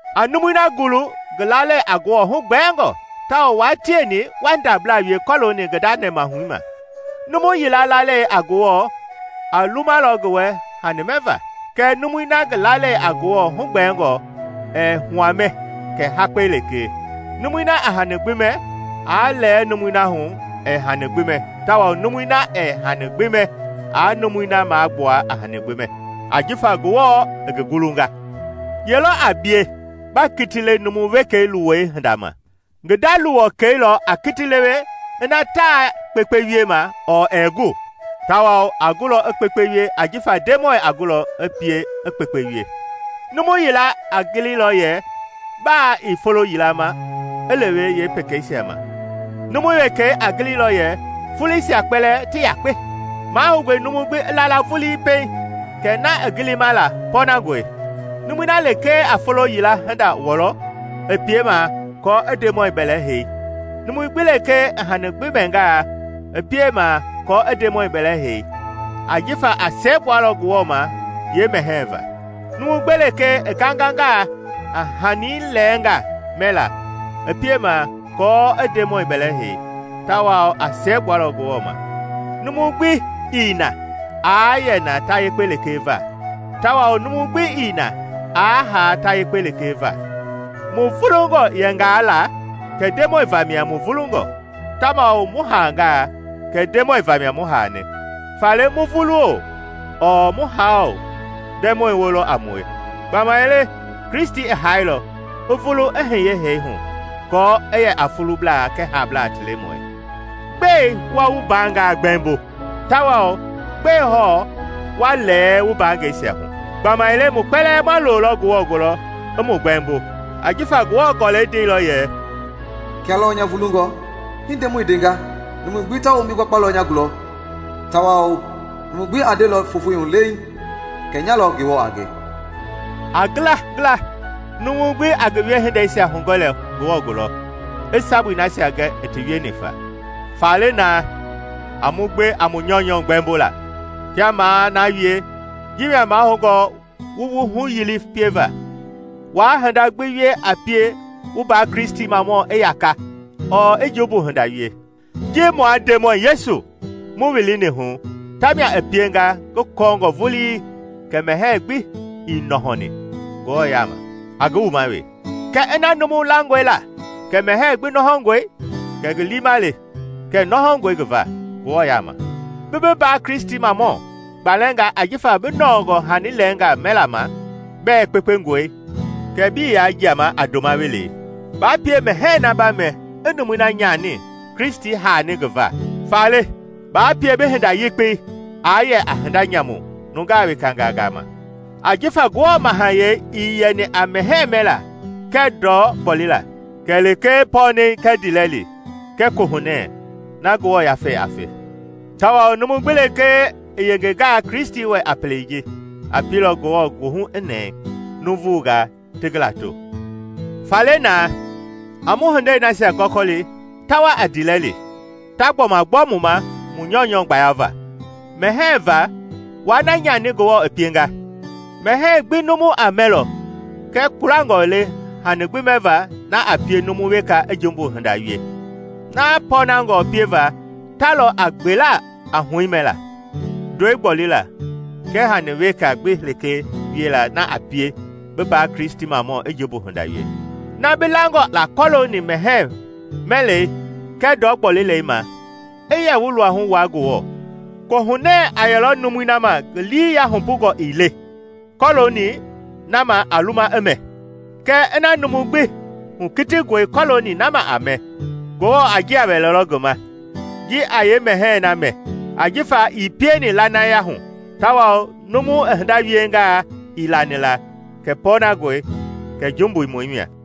A numui na gulu ngi lalei a Ngewɔ hugbɛɛngɔ tawao wua tieni waa ndabla wie kɔlooni ngi nda nɛmahui ma. Numu yila lalei a Ngewɔ a lumalɔ ngi wɛ hani mɛva, kɛɛ numui na ngi lalei a Ngewɔ hugbɛɛngɔ ɛɛ hua mɛ kɛ hakpɛi lekee. Numui na a hani gbi mɛ, aa lɛɛ numui na hu ɛɛ hani gbi mɛ tawao numui na ɛɛ hani gbi mɛ aa numui na magbua a hani gbi mɛ, ajifa Ngewɔ i ngi gulunga. Ye lɔ a bie ba kiti lewe numu wekei luwɔi hinda ma? Ngi nda luwɔkɛi lɔ a kiti lewe ina taa kpekpe wiema ɔɔ ɛɛ gu. Tawao a gulɔ i kpekpe wie ajifa Ndemɔi a gulɔ i pie i kpekpe wie. Numu yila a gililɔ yɛ baa i folo yila ma i lewe yee pekeisia ma, numu wekei a gili lɔ yɛ foloisia kpɛlɛɛ ti yakpe. Mahoungɔe numu gbi i la la vulii pɛiŋ kɛ na i gilima la pɔɔnangɔe. Numui na lekee a folo yila hinda wɔlɔ, i piemaa aako i Ndemɔi bɛlɛhei; numu gbi lekee i hani gbi mɛngaa, i piemaa aako i Ndemɔi bɛlɛhɛi, ajifa a siɛgbualɔ Ngewɔ ma yeemɛhɛɛ va. Numu gbi lekee i gangangaa a hani lɛɛngaa mɛlaa, i piemaa aako i Ndemɔi bɛlɛ hei, tawao a siɛgbualɔ Ngewɔ ma. Numu gbi ii na aa yɛ na ta yekpe lekee va, tawao numu gbi ii na aa haa ta yakpe lekee va. Mu vulungɔ yɛngaa la, kɛ Ndemɔi vamia mu vulungɔ, tawao mu haangaa, kɛ Ndemɔi vamia mu haani. Faale mu vulu-o, ɔɔ mu haa-o, Ndemɔi woo lɔ a mue. Gbamaile Kristi i haailɔ, i vulu i hiye hee hu aako i yɛ a fuublaa kɛɛ haablaa ti Lemɔi. Gbɛe wa wu mbaangaa gbɛmbo? Tawao gbɛe hɔɔ wa lɛɛ wu mbaangɛisia hu? Gbamaile mu kpɛlɛɛ ma loolɔ Ngewɔ gulɔ i mu gbɛɛmbo. Ajifa Ngewɔ Gɔlɛi ndeilɔ yɛ, “Kia lɔɔ nya vulungɔ, hii Ndemɔi i ndenga, numui gbi ta wombi gbakpalɔ nya gulɔ, tawao numu gbi a ndelɔ fofoi hu leiŋ kɛ nyalɔ Ngewɔ a nge.” A ngila ngila, numu gbi a ngi wiehindeisia hugɛlɔ Ngewɔ gulɔ, i sabui nasia gɛ i ti wieni fa. Faale naa, a mu gbe a mu nyɔunyɔ gbɛmbo la. Kia maa na wie, ji mia mahoungɔ wu wu huyili pieva: waa hinda gbi wie a pie wu mbaa Kristimamɔ i yaka ɔɔ i jumbu hinda wie. Ji mua Ndemɔi Yesu mu wilini hu, tamia i pienga ngi kɔɔngɔ vulii kɛ mɛhɛɛ gbi ii nɔhɔni Ngewɔ yaama a ngi wuma wee; kɛɛ ina numu langɔe la kɛ mɛhɛɛ gbi nɔhɔngɔe, kɛ ngi liima le kɛ nɔhɔngɔe ngi va Ngewɔ yaama. Bi bi mbaa Kristimamɔ gbalɛngaa ajifa bi nɔɔngɔ hani lɛɛngaa mɛla ma bɛɛ kpekpengɔe, kɛ bii yaa jiama a ndoma welei. Baa pie mɛhɛɛ na ba mɛ i numui na nyani Kristi haani ngi va. Faale, baa pie bi hinda yekpei aa yɛ a hinda nyamu nungaa wekangaa gama. Ajifa Ngewɔ mahayɛi ii yɛni a mɛhɛɛ mɛlaa kɛɛ ndɔ gbolila, kɛlee pɔɔnɛi kɛɛ ndiilɛli kɛɛ Kohunɛ na Ngewɔ Yafei a fe. Tawao numu gbi lekee i yengengaa Kristi wɛ a pelei ji, a pielɔ Ngewɔ goohu i nɛɛ, nuuvugaa ti ngi lato. Faale naa, a mu hindei nasia gɔkɔli ta wa a ndiilɛli, ta gbɔma gbɔ mu ma mu nyɔunyɔ gbayava. Mɛhɛɛ va, waa na nyani Ngewɔ i pienga. Mɛhɛɛ gbi numu a mɛlɔ kɛɛ kpulangɔ le hani gbi mɛva na a pie numu weka i jumbu hinda wie. Na pɔnangɔ pieva ta lɔ a gbela a huɛi mɛla, ndɔi gbolila kɛɛ hani weka gbi lekee wiela na a pie bi mbaa Kristimamɔ i jumbu hinda wie. Na bi langɔ la kɔlooni mɛhɛɛ mɛlɛi kɛɛ ndɔ gbolilei ma i yɛ wu luahu wua Ngewɔ. Kohunɛ a yɛlɔ numui ma ngi lii yahupungɔ i le kɔlooni na ma a luma i mɛ. Kɛɛ ina numu gbi hukitingɔe kɔlooni na ma a mɛ, Ngewɔ a njia wɛlɛlɔ ngi ma ji a yeemɛhɛɛ na mɛ, ajifa ii pieni lanaya hu; tawao numu i hinda wienga ii lani la kɛ pɔɔnangɔe, kɛ jumbui mia.